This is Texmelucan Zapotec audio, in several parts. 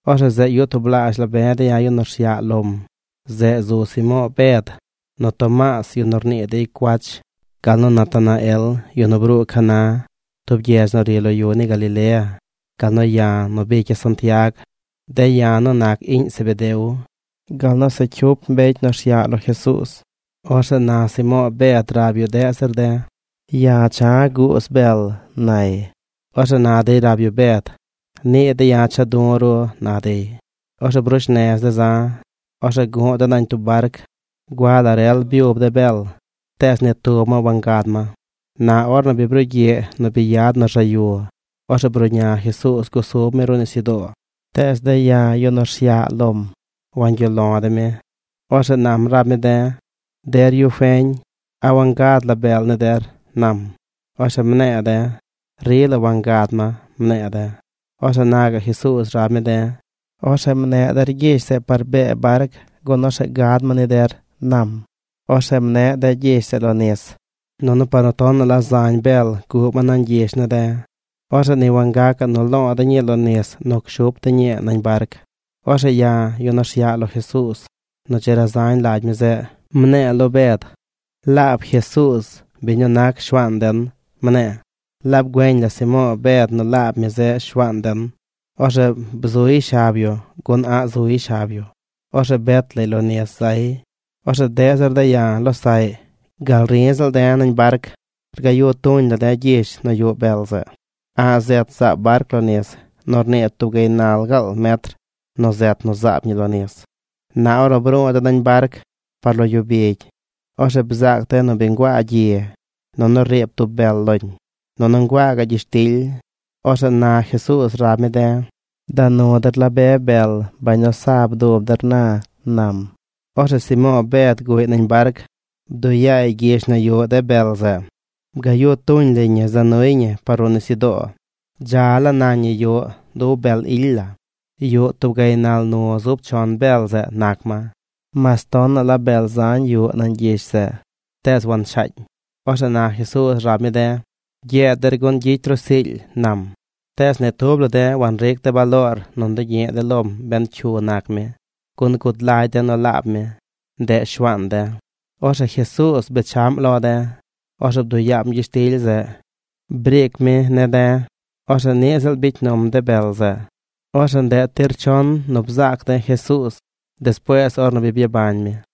Orzeꞌ zeꞌ yuꞌ tublaazh la be de yu nu rsyaꞌ lom. Zeꞌ zu Simo̱o̱ Bed, nu Tomaas, yu nu rnii dey cuach, gal nu Natanael, yu nu bruu Caná, tub gyedz nu ri lo yu ni Galilea, gal nu ya̱ nu bicya̱ Santiag, de̱ ya̱ nu nac iꞌñ Zebedeo, gal nu se cyup mbecy nu rsyaꞌ lo Jesuuz. Orzeꞌ na Simo̱o̱ Bed rab yu deꞌ zir de̱: ―Ya̱ cha̱ guuz bel ―nay. Orzeꞌ na dey rab yu Bed: ―Niꞌ de̱ ya̱ cha̱ du̱ ru ―na dey. Orzeꞌ brush nez de̱ za̱. Orzeꞌ guꞌ de̱ nañ tub barc. Gua la rel byub de̱ bel tees ni tub ma wangad ma. Na ornu bi brugyiꞌ nu bi yad nu rzaꞌ yu, orzeꞌ bruꞌña Jesuuz gusub mi ruꞌ nisyudoo. Tees de̱ ya̱, yu nu rsyaꞌ lom, wangyuꞌ lo de̱ mi. Orzeꞌ nam rab mi de̱: ―Der yu feñ, ¿a wangad la bel ni der? ―nam. Orzeꞌ mne̱e̱ de̱: ―Rila wangad ma ―mne̱e̱ de̱. Orzeꞌ na gaꞌ Jesuuz rab mi de̱: ―Orzeꞌ mneꞌ der gyish zeꞌ par bee barc gun orzeꞌ gad ma ni der ―nam. Orzeꞌ mneꞌ de̱ gyish zeꞌ lo nis, nunu par nu tonaꞌ la zañ bel guꞌ ma nañ gyish ne̱ de̱, orzeꞌ ni wagacaꞌ nu loo de̱ ñii lo nis nu cshup de̱ ñii nañ barc. Orzeꞌ ya̱, yu nu rsyaꞌ lo Jesuuz nu dzi razañ lagy mi zeꞌ, mne̱e̱ lo Bed: ―¡Laab Jesuuz, biñ nu nac Shuaan den! ―Mne̱e̱. Laab güeñ la Simo̱o̱ Bed nu laab mi zeꞌ Shuaan den, orzeꞌ bzuy shab yu gun a̱ꞌ zuy shab yu. Orzeꞌ bet lay lo nis zay. Orzeꞌ deꞌ zir de̱ ya̱, losaꞌy, gal ri ziꞌl de̱ nañ barc rgayu̱ tuñ la de̱ gyish nu yuꞌ bel zeꞌ. A̱ꞌ zet zaab barc lo nis. Nu rnii tub gaynal gaal metr nu zet nu zaab ñi lo nis. Na ornu bru̱u̱ de̱ nañ barc par lo yu bigy, orzeꞌ bzaac de̱ nu bi nguaa gyi nunu riib tub bel loñ. Nunu nguaa gaꞌ gyishtily. Orzeꞌ na Jesuuz rab mi de̱: ―Da nu der la be bel, bañ nu sa bdub der na ―nam. Orzeꞌ Simo̱o̱ Bed guꞌy nañ barc. Bduꞌ yaay gyish nu yuꞌ de bel zeꞌ. Bgaꞌ yu tuñ lay ñi za nuy ñi par ruꞌ nisyudoo. Dza la nañ ñi yuꞌ du ub bel ily la. Yuꞌ tub gaynal nu̱ zub chon bel zeꞌ nac ma. Mas tonaꞌ la bel zañ yuꞌ nañ gyish zeꞌ, tees wanshaañ. Orzeꞌ na Jesuuz rab mi de̱: ―Gyeed der gun gyicy ru siily ―nam. Tees ni tub la de̱ wanric de̱ baloor nu ndugyi̱ꞌ de̱ lom ben cyu nac mi, gun gud lagy de̱ nu laab mi, ndeꞌ Shuaan de̱. Orzeꞌ Jesuuz bechaꞌm lo de̱. Orzeꞌ bduꞌ yaam gyishtily zeꞌ. Briic mi ne̱ de̱. Orzeꞌ niꞌ ziꞌl bicy num de bel zeꞌ. Orzeꞌ ndeꞌ tir chon nu bzaac de̱ Jesuuz despuees ornu bi byabañ mi.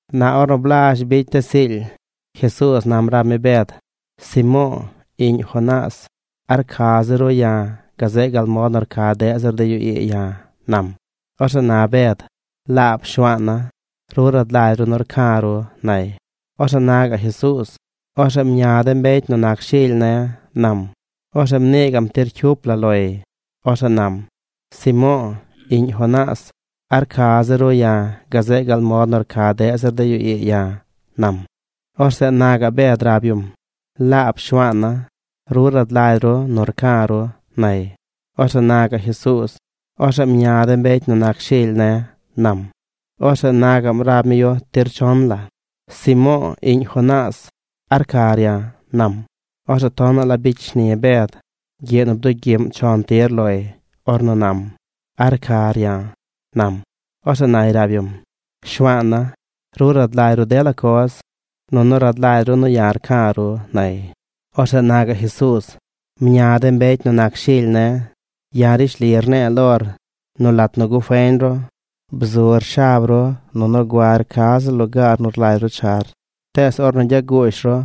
Na ornu blazh bicy de̱ siily, Jesuuz nam rab mi Bed: ―Simo̱o̱, iꞌñ Jonás, ¿a rca zir ru ya̱, gazeꞌ gal mod nu rca deꞌ zir de yu ii ya̱? ―nam. Orzeꞌ na Bed: ―Laab Shuaana̱, ru rad lagy ru nu rca̱ ru ―nay. Orzeꞌ na gaꞌ Jesuuz: ―Orzeꞌ mña de mbecy nu nac shily ne̱ ―nam. Orzeꞌ mnii gaꞌm tir cyup la loy. Orzeꞌ nam: ―Simo̱o̱, iꞌñ Jonás, ¿a rca zir ru ya̱, gazeꞌ gal mod nu rca deꞌ zir de yu ii ya̱? ―nam. Orzeꞌ na gaꞌ Bed rab yum: ―Laab Shuaana̱, ru rad lagy ru nu rca̱ ru ―nay. Orzeꞌ na gaꞌ Jesuuz: ―Orzeꞌ mña de mbecy nu nac shily ne̱ ―nam. Orzeꞌ na gaꞌm rab mi yu tir chon la: ―Simo̱o̱, iꞌñ Jonás, ¿a rcar ya̱? ―nam. Orzeꞌ tonaꞌ la bicy shni Bed gyiꞌ nu bdugyiꞌm chon tir loy ornu nam: “¿A rcar ya̱?” nam. Orzeꞌ nay rab yum: ―Shuaana̱, ru rad lagy ru dela coz. Nunu rad lagy ru nu ya̱ rca̱ ru ―nay. Orzeꞌ na gaꞌ Jesuuz. ―Mña de mbecy nu nac shily ne̱. Ya̱ rishli rne̱e̱ lor nu lat nu gufeñ ru, bzur shab ru nunu guar ca ziꞌl lugaar nu rlagy ru char. Tees ornu gyaguush ru,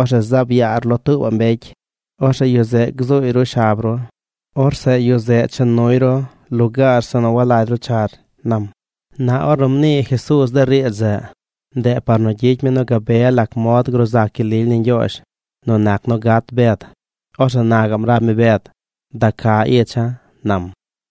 orzeꞌ zaab yaar lo tuubaꞌ mbecy. Orzeꞌ yu zeꞌ gzuuy ru shab ru. Orzeꞌ yu zeꞌ cha nuy ru lugaar zeꞌ nu walagy ru char ―nam. Na ornu mnii Jesuuz de riidz zeꞌ, ndeꞌ par nu gyicy mi nu gabe lac mod gruu zac gyel lily ni Ñgyoozh nu nac nu gat Bed. Orzeꞌ na gaꞌm rab mi Bed: ―¡Da ca icha̱! ―nam.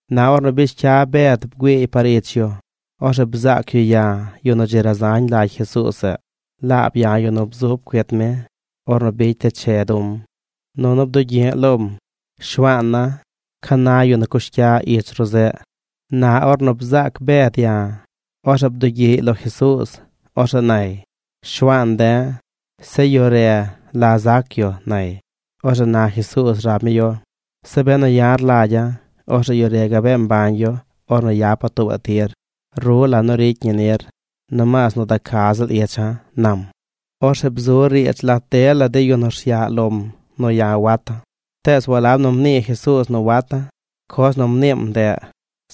Na ornu bish cya Bed bgüiiy par ich yu, orzeꞌ bzaac yu ya̱, yu nu dzi razañ lagy Jesuuz zeꞌ. Laab ya̱ yu nu bzub cuit mi ornu bicy de̱ che du̱m, nunu bdugyi̱ꞌ lom: “Shuaana̱, ¿ca na yu nu cush cya ich ru zeꞌ?” Na ornu bzaac Bed ya̱, orzeꞌ bdugyiꞌy lo Jesuuz. Orzeꞌ nay: ―Shuaan de̱, se yu re, ¿la zac yu? ―nay. Orzeꞌ na Jesuuz rab mi yu: ―Zeꞌ benu ya̱ rlagya̱, orzeꞌ yu re gabee mbañ yu ornu yapa̱ tuubaꞌ tir. Ru, ¿la nu ricy ñi nir? Nomaas nu da ca ziꞌl icha̱ ―nam. Orzeꞌ bzu riidz lat dela de yu nu rsyaꞌ lom nu ya̱ wata̱. Tees walab nu mnii Jesuuz nu wata̱. Coz nu mniim ndeꞌ: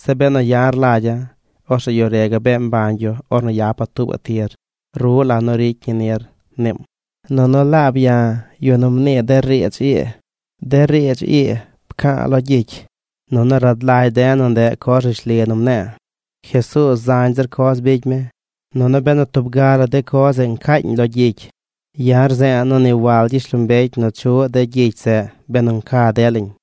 “Zeꞌ benu ya̱ rlagya̱, orzeꞌ yu re gabee mbañ yu ornu yapa̱ tuubaꞌ tir. Ru, ¿la nu ricy ñi nir?”, mniim. Nunu laab ya̱, yu nu mnii de riidz ii. De riidz ii pca̱a̱ lo gyicy; nunu rad lagy de̱ nu ndeꞌ coz rishli nu mne̱e̱. Jesuuz zañ zir coz bicy mi. Nunu benu tub ga la de coz zeꞌ ncaañ lo gyicy, ya̱ rze̱e̱ nu ni wal gyishlombecy nu chuꞌ de gyicy zeꞌ, benu nca delañ.